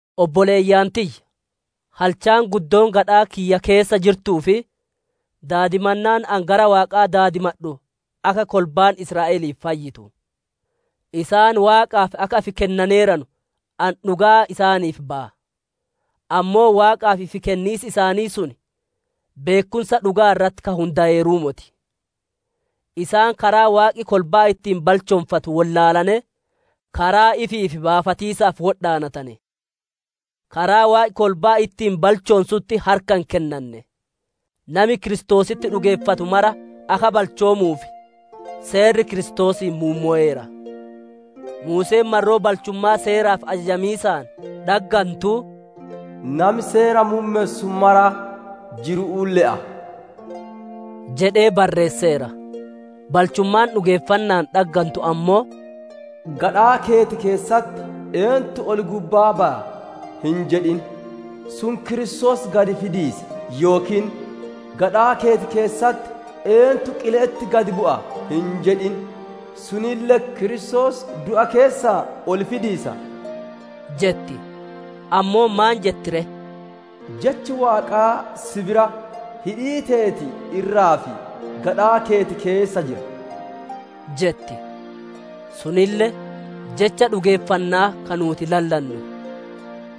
Obboleeyyan tiyya! Halchaan guddoon gadhaa kiyya keessa jirtuu fi daadimannaan ani gara Waaqaa daadimadhu akka kolbaan Israa'elii fayyitu. Isaan Waaqaaf akka ifi kennaneeranu ani dhugaa isaaniif baya; ammoo Waaqaaf ifi kenniis isaanii sun beekkumsa dhuga'aa irratti ka hundayeeruu moti. Isaan karaa Waaqi kolbaa ittiin balchoonfatu wollaalanee, karaa ifiif baafatiisaaf wodhaanane; karaa Waaqi kolbaa ittiin balchoonsutti harka hin kennanne. Nami Kiristoositti dhugeeffatu mara akka balchoomuuf, Seerri Kiristoosiin muummoweera. Muuseen marroo balchummaa Seeraaf ajajamiisaan dhaggantuu, «Nami Seera muummessu mara jiru'uun le'a» jedhee barreesseera. Balchummaan dhugeeffanna'aan dhaggantu ammoo, «Gadhaa keeti keessatti, ‹Eentu ol-gubbaa baya?› hin jedhin; sun, Kiristoos gad fidiisa. Yookiin, gadhaa keeti keessatti, ‹Eentu qile'etti gad bu'a?› hin jedhin; sunille, Kiristoos du'a keessaa ol fidiisa» jetti. Ammoo maan jetti ree? «Jechi Waaqaa si bira, hidhii teeti irraa fi gadhaa keeti keessa jira» jetti. Sunille, jecha dhugeeffanna'aa ka nuuti lallannu.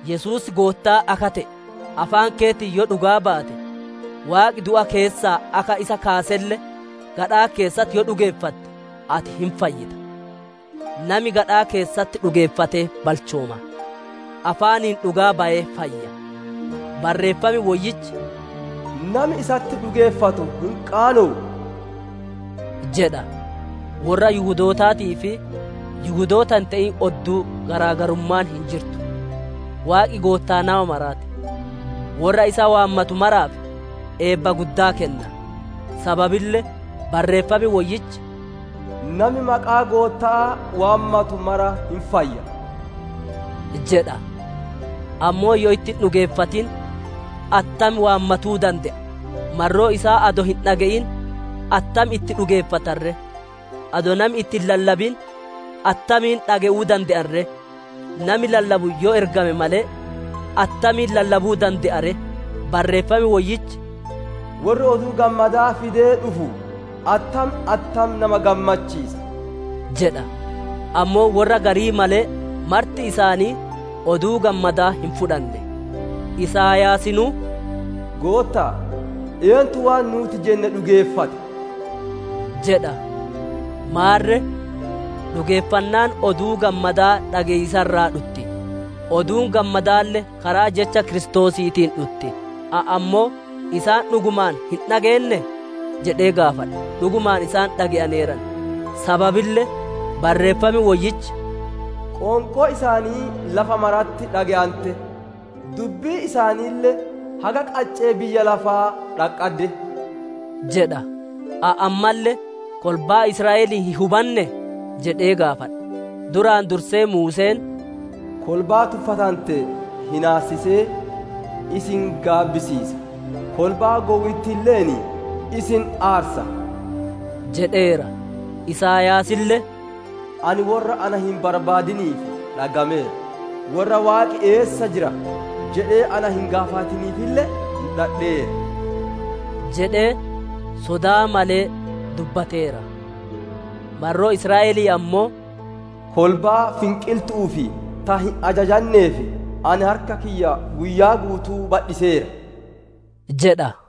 Yesuus Goottaa akka te'e, afaan keetiin yoo dhugaa baate, Waaqi du'a keessaa akka isa kaaselle, gadhaa keessatti yoo dhugeeffatte, ati hin fayyita. Nami gadhaa keessatti dhugeeffatee balchooma; afaaniin dhugaa bayee fayya. Barreeffam Woyyichi, «Nami isatti dhugeeffatu hin qaanowu» jedha. Worra Yihudootaatii fi Yihudoota hin te'in odduu garaagarummaan hin jirtu; Waaqi Goottaa nama maraa ti; worra isa waammatu maraaf eebba guddaa kenna. Sababille Barreeffam Woyyichi, «Nami maqaa Gootta'aa waammatu mara hin fayya» jedha. Ammoo yoo itti hin dhugeeffatin attam waammatuu dande'a? Marroo isaa adoo hin dhage'in attam itti dhugeeffatan ree? Adoo nami itti hin lallabin attamiin dhage'uu dande'an ree? Nami lallabu yoo ergame malee, attamiin lallabuu dande'a ree? Barreeffam Woyyichi, «Worri Oduu Gammadaa fidee dhufu, attam attam nama gammachiisa!» jedha. Ammoo worra garii malee marti isaanii Oduu Gammadaa hin fudhanne. Isaayaasinuu, «Gootta'a, eentu waan nuuti jenne dhugeeffate?» jedha. Maarre, dhugeeffannaan Oduu Gammadaa dhage'iisa irraa dhutti; Oduun Gammadaalle karaa jecha Kiristoosiitiin dhutti. Ani ammoo, isaan dhugumaan hin dhageennee? Jedhee gaafadha. Dhugumaan isaan dhage'aneeran; sababille Barreeffam Woyyichi, «Qoonqoon isaanii lafa maratti dhage'ante; dubbiin isaaniille haga qaccee biyya lafaa dhaqqadde» jedha. Ani ammalle, kolbaan Israa'elii hin hubannee? Jedhee gaafadha. Duraan dursee Muuseen, «Kolbaa tuffatante hinaassisee, isin gaabbisiisa; kolbaa gowwitti'illeen isin aarsa» jedheera. Isaayaasille, «Ani worra ana hin barbaadiniif dhaggameera; worra ‹Waaqi eessa jira› jedhee ana hin gaafatiniifille mudhadheera» jedhee sodaa malee dubbateera. Marroo Israa'elii ammoo, «Kolbaa finqiltu'uu fi ta hin ajajanneef, ani harka kiyya guyyaa guutuu badhiseera» jedha.